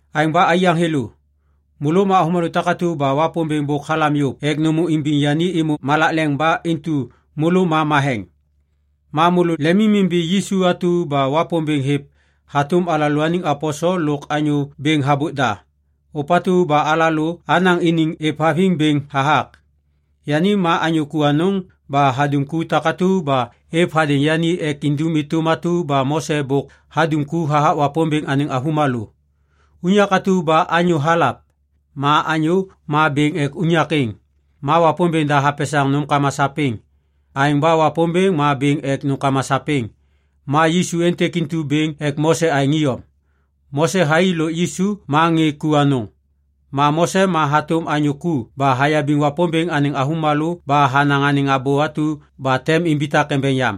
Aêŋ ba aiyaŋ thêlô, môlô ma avômalô takatu ba Wapômbêŋ bôk halam yôv ek nômô imbiŋ yani êmô malak leŋ ba intu môlô ma matheŋ. Ma môlô lemimimbi Yisu atu ba Wapômbêŋ hêv hatôm alalôaniŋ aposel lôk anyô bêŋ habôk da, ôpatu ba alalô anaŋ iniŋ êvhaviŋ bêŋ hathak. Yani ma anyô ku anôŋ ba hadum ku takatu ba êv hadêŋ yani ek indum êtôm atu ba Mose bôk hadum ku hathak Wapômbêŋ anêŋ avômalô. Unyak atu ba anyô halav. Ma anyô ma bêŋ ek unyak êŋ. Ma Wapômbêŋ da hapesaŋ nômkama sapêŋ. Aêŋ ba Wapômbêŋ ma bêŋ ek nômkama sapêŋ. Ma Yisu êntêk intu bêŋ ek Mose aêŋ iyom. Mose thai lôk Yisu ma ŋê ku anôŋ. Ma Mose ma hatôm anyô ku ba hayabiŋ Wapômbêŋ anêŋ avômalô ba hanaŋ anêŋ abô atu ba tem imbitak embeŋ yam.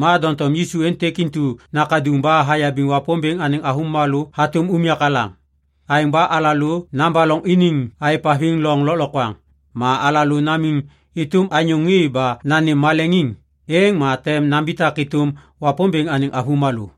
Ma doŋtom Yisu êntêk intu nakaduŋ ba hayabiŋ Wapômbêŋ anêŋ avômalô hatôm unyak alaŋ. Aêŋ ba alalô nabaloŋ iniŋ aêvhaviŋ loŋ lôklokwaŋ. Ma alalô namiŋ êtôm anyô ŋê ba nanêm maleŋiŋ, êŋ ma tem nambitak êtôm Wapômbêŋ anêŋ avômalô.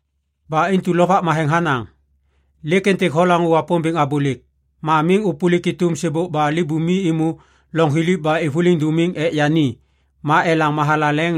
Ba intu Lovak Matheŋ hanaŋ, “Lêk êntêk holaŋô Wapômbêŋ abôlêk, ma miŋ ôpôlik êtôm sêbôk ba libumi êmô loŋ thiliv ba êvôliŋ dômiŋ ek yani ma elaŋ mathalaleŋ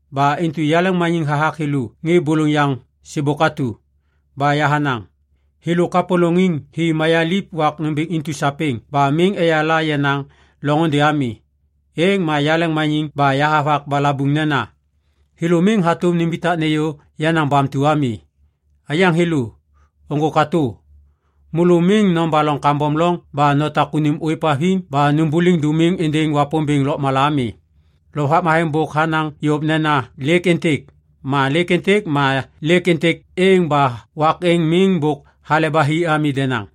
Ba intu yaleŋmaniŋ hathak thêlô ŋê bôlôŋ yaŋ sêbôk atu. Ba yahanaŋ, “Thêlô kapôlôŋ hi mayaliv wak nômbêŋ intu sapêŋ ba miŋ eyala yenaŋ loŋôndê ami.” Êŋ ma yaleŋmaniŋ ba yahavak balabuŋ nena, “Thêlô miŋ hatôm nimbitak nêyô yenaŋ bamtu ami.”’” Aiyaŋ thêlô, ôŋgô katô. Môlô miŋ nobaloŋ kambom loŋ ba notak unim ôêvhaviŋ ba nômbôliŋ dômim êndêŋ Wapômbêŋ lôkmala ami. Lovak Matheŋ bôk hanaŋ yôv nena “lêk êntêk”. Ma lêk êntêk ma lêk êntêk êŋ ba wak êŋ miŋ bôk hale ba hi ami denaŋ.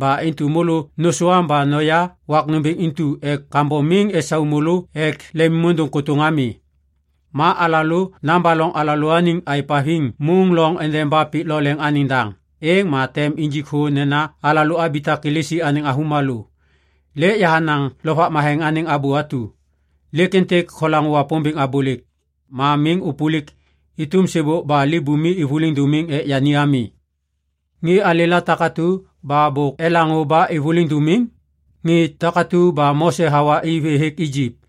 Ba intu môlô nôsôam ba noya wak nômbêŋ intu ek kambom miŋ esau môlô ek lemimôndôŋ kôtôŋ ami. Ma alalô nabaloŋ alalôaniŋ aêvhaviŋ môŋ loŋ endeba pik lo leŋ anêŋ daŋ, êŋ ma tem injik thô nena alalô abitak Kilisi anêŋ avômalô. Lêk yahanaŋ Lovak Matheŋ anêŋ abô atu, “Lêk êntêk holaŋô Wapômbêŋ abôlêk, ma miŋ ôpôlik êtôm sêbôk ba libumi êvôliŋ dômiŋ ek yani ami.” Ŋê alêla takatu ba bôk elaŋô ba êvôliŋ dômiŋ? Ŋê takatu ba Mose hawa i vê hêk Ijip!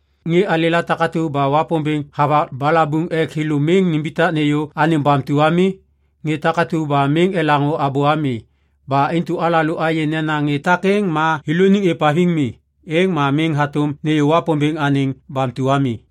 Ŋê alêla takatu ba Wapômbêŋ havak balabuŋ ek thêlô miŋ nimbitak nêyô anêŋ bamtu ami? Ŋê takatu ba miŋ elaŋô abô ami! Ba intu alalô ayê nena ŋê takêŋ ma thêlôniŋ êvhaviŋ mi. Êŋ ma miŋ hatôm nêyô Wapômbêŋ anêŋ bamtu ami.